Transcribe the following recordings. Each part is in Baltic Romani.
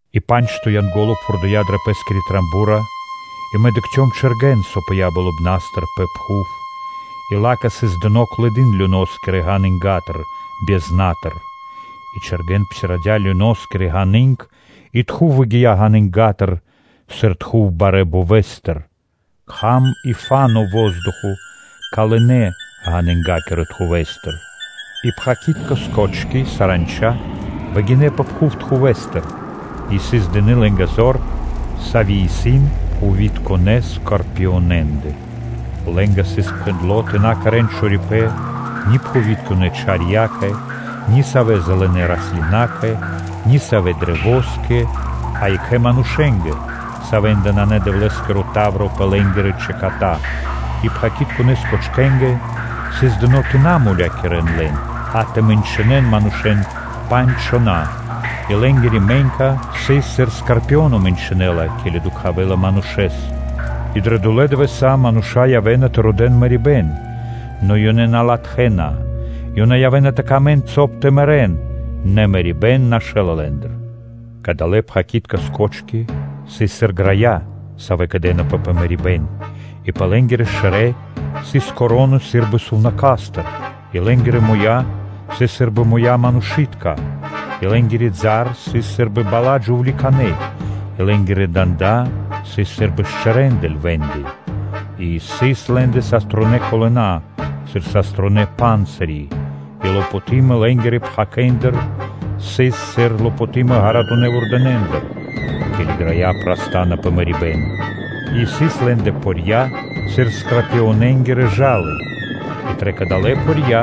И па́нджто Янго́ло пхурдыя дрэ пэ́скиро ро́го; и мэ дыкхцём чэргэн, со пыя́ болыбна́стыр пэ пхув, и ла́кэ сыс дыно́ клыдын люноскирэ ганынгатыр (безнатыр). И чэргэн псирадя (отпхандя) люноскири ґаны́нг и тхув (дымо) выгия́ ґанынгатыр, сыр тхув барэ́ бовэстыр: кхам и фа́но (воздухо) калынэ ґанынгакирэ тхувэстыр. И пхакитка скочки (саранча) выгинэ́ пэ пхув тхувэстыр и сыс дыны́ лэ́нгэ зор, сави́ исын пхувитконэ скорпионэндэ. Лэ́нгэ сыс пхэндло́ тэ на кэрэ́н чорипэ́н ни пхувитконэ чарьякэ, ни савэ́ зэлэнэ раслинакэ, ни савэ́ каштэскэ (дрэвоскэ), а екх манушэ́нгэ, савэ́ндэ на сыс Дэвлэ́скиро та́вро пэ лэ́нгирэ чэката: и пхакитконэ скочкэнгэ сыс дыно́ тэ на мулякирэ́н лэн, а тэ мэнчынэн манушэ́н пандж чхона́; и лэ́нгири мэнька сыс сыр скорпионо мэнчынэла, ке́ли дукхавэла манушэ́с. И дрэ долэ́ дывэса́ мануша́ явэ́на тэ родэ́н мэрибэ́н, нэ ёнэ на латхэ́на; ёнэ явэ́на тэ мангэ́н, соб (кай) тэ мэрэ́н, нэ мэрибэ́н нашэла лэ́ндыр. Кадалэ́ пхакитка скочки (саранча) сыс сыр грая, савэ́ кэдынэпэ пэ мэрибэ́н; и пэ лэ́нгирэ шэрэ́ сыс вянки (короны) сы́рбы сувнака́стыр, и лэ́нгирэ муя́ сыс сы́рбы муя́ манушы́тка. И лэ́нгирэ бала́ сыс сы́рбы бала́ джувликанэ́, и лэ́нгирэ данда́ сыс сы́рбы шчэрэндэ (левэндэ), и сыс лэ́ндэ саструнэ́ колына сыр саструнэ́ панцыри, и лопотымо лэ́нгирэ пхакэндыр сыс сыр лопотымо ґаратунэ́ вурдэнэндыр, ке́ли грая праста́на пэ мэрибэ́н; и сыс лэ́ндэ порья сыр скорпионэнгирэ жалы и дрэ кадалэ́ порья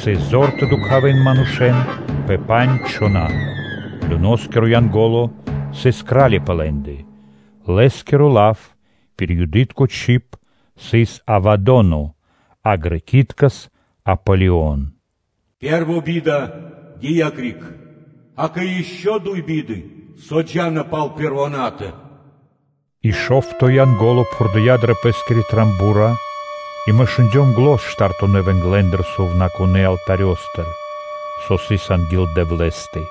сыс зор тэ дукхавэн манушэ́н пэ пандж чхона́. Люноскиро (Адоскиро) Янго́ло сыс кра́ли пэ лэ́ндэ. Лэ́скиро лав пир Юды́тко чиб сыс “Абаддон”, а грэки́ткэс (балами́ткэс) “Апполион.” Пэ́рво би́да гия́ криг, акэ, ишчо (инкэ́) дуй биды, со джа́на пал пэрвонатэ. И шо́вто Янго́ло пхурдыя дрэ пэ́скиро ро́го и мэ шундём зан штартонэ вэнглэндыр сувнакунэ́ алтарёстыр, со сыс анги́л Дэвлэ́стэ,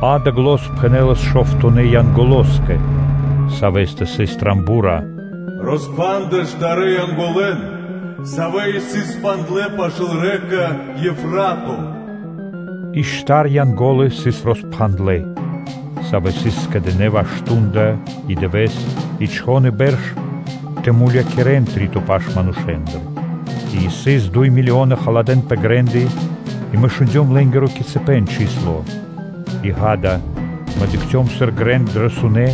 ґа́да, зан пхэнэлас шовтонэ Янголоскэ, савэ́стэ сыс ро́го: “Роспхандэ штарэ́ Янголэн, савэ́ исын пхандлэ пашы́л рэка (лэнь) Евфрато.” И штар Янго́лы сыс роспхандлэ, савэ́ сыс скэдынэ́ ваш шту́нда и дывэ́с, и чхон, и бэрш тэ мулякирэ́н три́то паш манушэ́ндыр; и сыс дуй милионы халадэ́н пэ грэ́ндэ и мэ шундём лэ́нгиро кицыпэн (количэство). И, ґа́да, мэ дыкхцём грэн сы́рбы дрэ сунэ́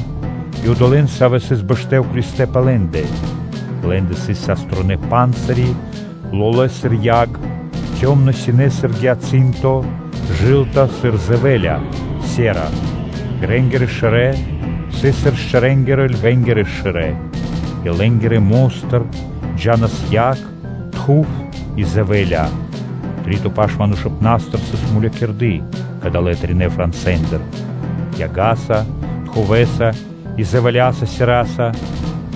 и одолэ́н, савэ́ сыс бэштэ́ уклистэ́ пэ лэ́ндэ; лэ́ндэ сыс саструнэ́ панцыри, лолэ́ сыр яг, цёмна-синэ сыр гиацынто, жылта сыр се́ра (дзэвэ́ля). Грэнгирэ шэрэ́ сыс сыр шчэрэнгирэ (левэнгирэ) шэрэ́, и лэ́нгирэ мо́стыр джа́лас яг, тхув и се́ра (дзэвэ́ля). Три́то паш манушыпнастыр сыс мулякирды далэ́ тринэ́ франсэ́ндыр: яга́са, тхувэса и дзэвэляса,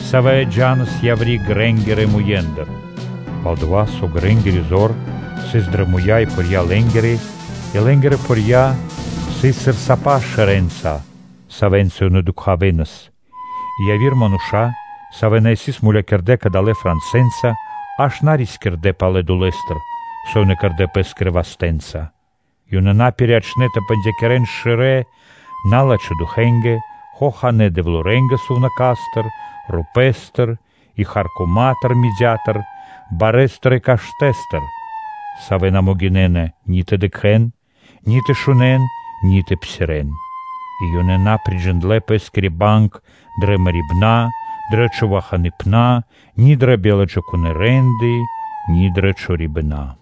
со джа́нас яври́ грэнгирэ муендыр. Пал-дова́ со грэнгири зор сыс дрэ муя́ и порья лэ́нгирэ: и лэ́нгирэ порья сыс сыр сапа шэрэнца, савэ́нца ёнэ дукхавэнас. И яви́р ману́ш, савэ́ на сыс мулякирдэ́ кадалэ́ франсэнца, аж на рискирдэ́ палэ долэ́стыр, со ёнэ кэрдэ́ пэ́скирэ вастэ́нца. Ёнэ на пириячнэ тэ бандякирэн шэрэ́ налачхэ́ духэнгэ, хоханэ́ дэвлэнгэ сувнака́стыр, рупэ́стыр и харкома́тыр, барэ́стыр и каштэ́стыр, савэ́ на могинэ́на ни тэ дыкхэ́н, ни тэ шунэ́н, ни тэ псирэ́н. И ёнэ на приджиндлэ пэ́скири банг дрэ мэрибэна, ни дрэ човаханыпэна, ни дрэ биладжакунэ́ рэ́нды, ни дрэ чорибэна.